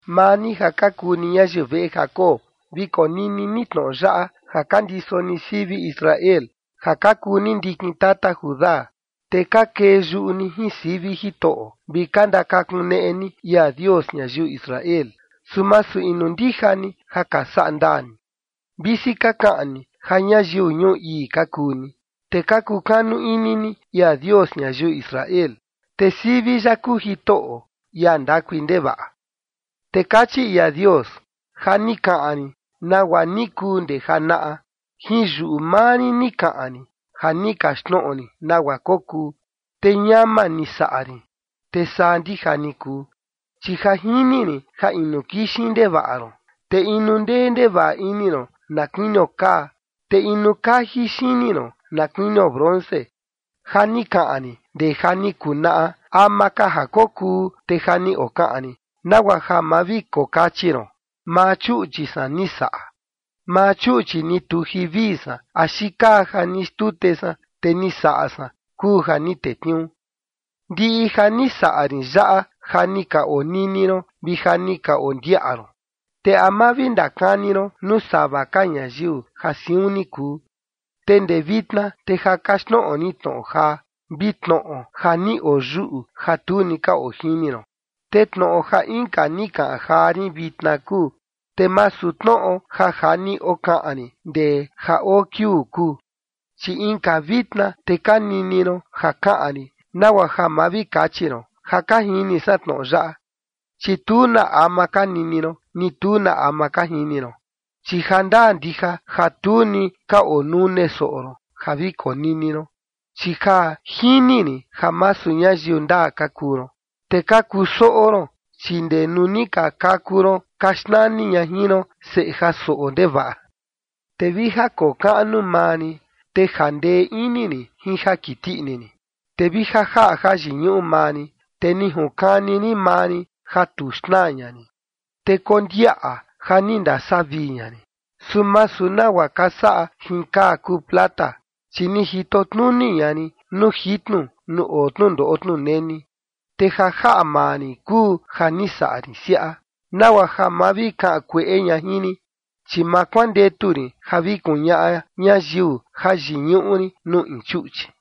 Maa ni ja ka kuu ni ñayiu veꞌe Jacob, vi konini ni tnoꞌo yaꞌa, ja ka ndiso ni sivi Israel, ja ka kuu ni ndikin tata Judá, te ka kee yuꞌu ni jin sivi Jitoꞌo, vi ka ndakakuneꞌe ni ia Dios ñayiu Israel. Su masu inu ndija ni ja ka saꞌa ndaa ni, visi ka kaꞌan ni ja ñayiu ñuu ii ka kuu ni, te ka kukanu ini ni ia Dios ñayiu Israel, te sivi ya kuu Jitoꞌo, ia ndakui ndevaꞌa. Te kachi ia Dios: “Ja ni kaꞌan rin nagua ni kuu ndee janaꞌa, jin yuꞌu maa rin ni kaꞌan rin ja ni kaxtnoꞌo rin nagua kokuu, te ñama ni saꞌa rin, te saa ndija ni kuu. Chi ja jini rin ja inu kixin ndevaꞌa ron, te inu ndee ndevaꞌa ini ron na kuinio kaa, te inu kaji xini ron na kuinio bronce. Ja ni kaꞌan rin ndee ja ni kuu naꞌa, ama ka ja kokuu, te ja ni okaꞌan rin, nagua ja ma vi kokachi ron: Maa chuꞌchi san ni saꞌa. Maa chuꞌchi ni tuji vii san axi kaa ja ni xtute san te ni saꞌa san kuu ja ni tetniuu. Ndiꞌi ja ni saꞌa rin yaꞌa, ja ni ka onini ron vi ja ni ka ondiaꞌa ron, ¿te a ma vi ndakani ron nuu sava ka ñayiu ja siun ni kuu? Te ndee vitna te ja kaxtnoꞌo rin tnoꞌo jaa vi tnoꞌo ja ni oyuꞌu ja tu ni ka ojini ron. Te tnoꞌo ja inka ni kaꞌan jaa rin vitna kuu, te masu tnoꞌo ja ja ni okaꞌan rin ndee ja oo kiuu kuu, chi inka vitna te ka nini ron ja kaꞌan rin nagua ja ma vi kachi ron: Ja ka jini san tnoꞌo yaꞌa. Chi tu na ama ka nini ron, ni tu na ama ka jini ron, chi jandaa ndija ja tu ni ka onune soꞌo ron ja vi konini ron. Chi ja jini rin ja masu ñayiu ndaa ka kuu ron, te ka kusoꞌo ron, chi ndee nuu ni ka kaku ron ka xnani ña jin ron: Seꞌe ja soꞌo ndevaꞌa. ’Te vi ja kokaꞌnu maa rin, te jandee ini rin jin ja kiti ini rin, te vi ja jaꞌa jayiñuꞌu maa rin, te junkani rin maa rin ja tu xnaa ña rin. Te kondiaꞌa ja ni ndasavii ña rin, su masu nagua ka saꞌa jin kaa kuu plata. Chi ni jito tnuni ña rin nuu jitnu nuu oo tnundoꞌo tnuneni. Te ja jaꞌa maa rin kuu ja ni saꞌa rin siaꞌa nagua ja ma vi kaꞌan kueꞌe ña jin rin, chi ma kuandetu rin ja vi kuñaꞌa ñayiu jayiñuꞌu rin nuu in chuꞌchi.”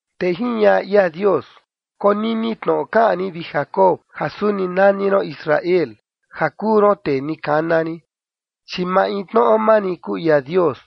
Te jiñaꞌa ia Dios: “Konini tnoꞌo kaꞌan rin, vi Jacob, ja suni nani ron Israel ja kuu ron tee ni kana rin, chi maintnoꞌo maa rin kuu ia Dios,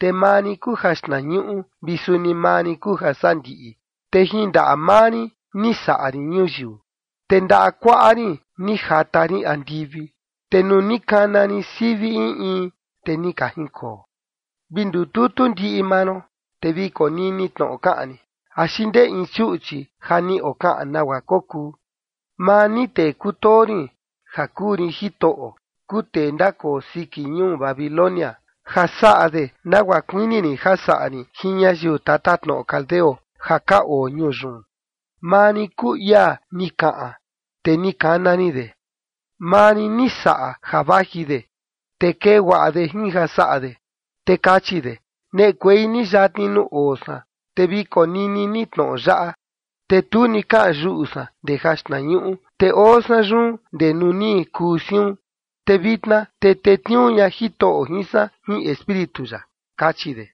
te maa rin kuu jaxtnañuꞌu vi suni maa rin kuu jasandiꞌi. Te jin ndaꞌa maa rin ni saꞌa rin ñuyiu, te ndaꞌa kuaꞌa rin ni jata rin andivi te nuu ni kana rin sivi in in, te ni ka jinkoo. ’Vi ndututu ndiꞌi maa ron, te vi konini tnoꞌo kaꞌan rin, ¿axi ndee in chuꞌchi ja ni okaꞌan nagua kokuu? Maa ni tee kutoo rin ja kuu rin Jitoꞌo, kuu tee ndakoo siki ñuu Babilonia, ja saꞌa de nagua kuini rin ja saꞌa rin jin ñayiu tatatnoꞌo caldeo ja ka oo ñuu yun. Maa rin kuu ia ni kaꞌan, te ni kana rin de. Maa rin ni saꞌa ja vaji de, te kee guaꞌa de jin ja saꞌa de. Te kachi de: Neꞌekuei ni yatni nuu oo san, te vi konini ni tnoꞌo yaꞌa: Tu ni kaꞌan yuꞌu san ndee jaxtnañuꞌu te oo san yun ndee nuu ni kuu siun, te vitna te tetniuu ña Jitoꞌo jin san jin Espíritu ya, kachi de.”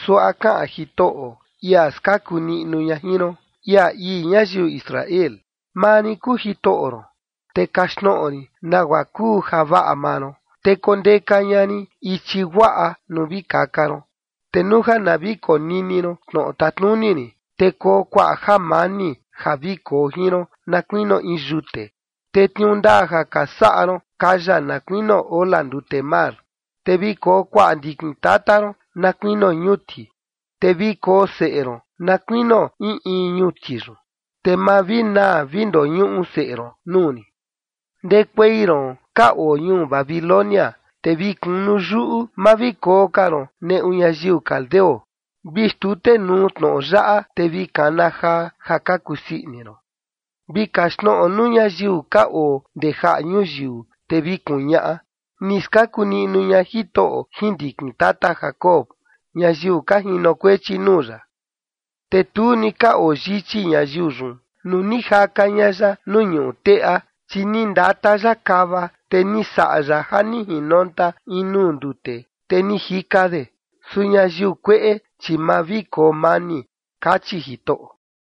Suaꞌa kaꞌan Jitoꞌo, ia skaku niꞌnu ña jin ron, ia ii ñayiu Israel: “Maa rin kuu Jitoꞌo ron, te kaxtnoꞌo rin nagua kuu javaꞌa maa ron, te kondeka ña rin ichi guaꞌa nuu vi kaka ron. Te nuu ja na vi konini ron tnoꞌo tatnuni rin, te koo kuaꞌa jamani ja vi koo jin ron na kuinio in yute, te tniuu ndaa ja ka saꞌa ron kaya na kuinio ola ndute mar. Te vi koo kuaꞌa ndikin tata ron na kuinio ñuti, te vi koo seꞌe ron na kuinio in in ñuti yun, te ma vi naa vi ndoñuꞌu seꞌe ron nuu rin. ’Ndekuei ron ka oo ñuu Babilonia, te vi kunu yuꞌu, ma vi koo ka ron neꞌu ñayiu caldeo. Vi xtutenuu tnoꞌo yaꞌa, te vi kana jaa ja ka kusii ini ron, vi kaxtnoꞌo nuu ñayiu ka oo ndee jaꞌa ñuyiu, te vi kuñaꞌa: Ni skaku niꞌnu ña Jitoꞌo jin ndikin tata Jacob, ñayiu ka jinokuechi nuu ya.” Te tu ni ka oo yichi ñayiu yun nuu ni jaka ña ya nuu ñuꞌu teꞌa, chi ni ndata ya kava, te ni saꞌa ya ja ni jinonta in nuu ndute, te ni jika de. “Su ñayiu kueꞌe, chi ma vi koo mani”, kachi Jitoꞌo.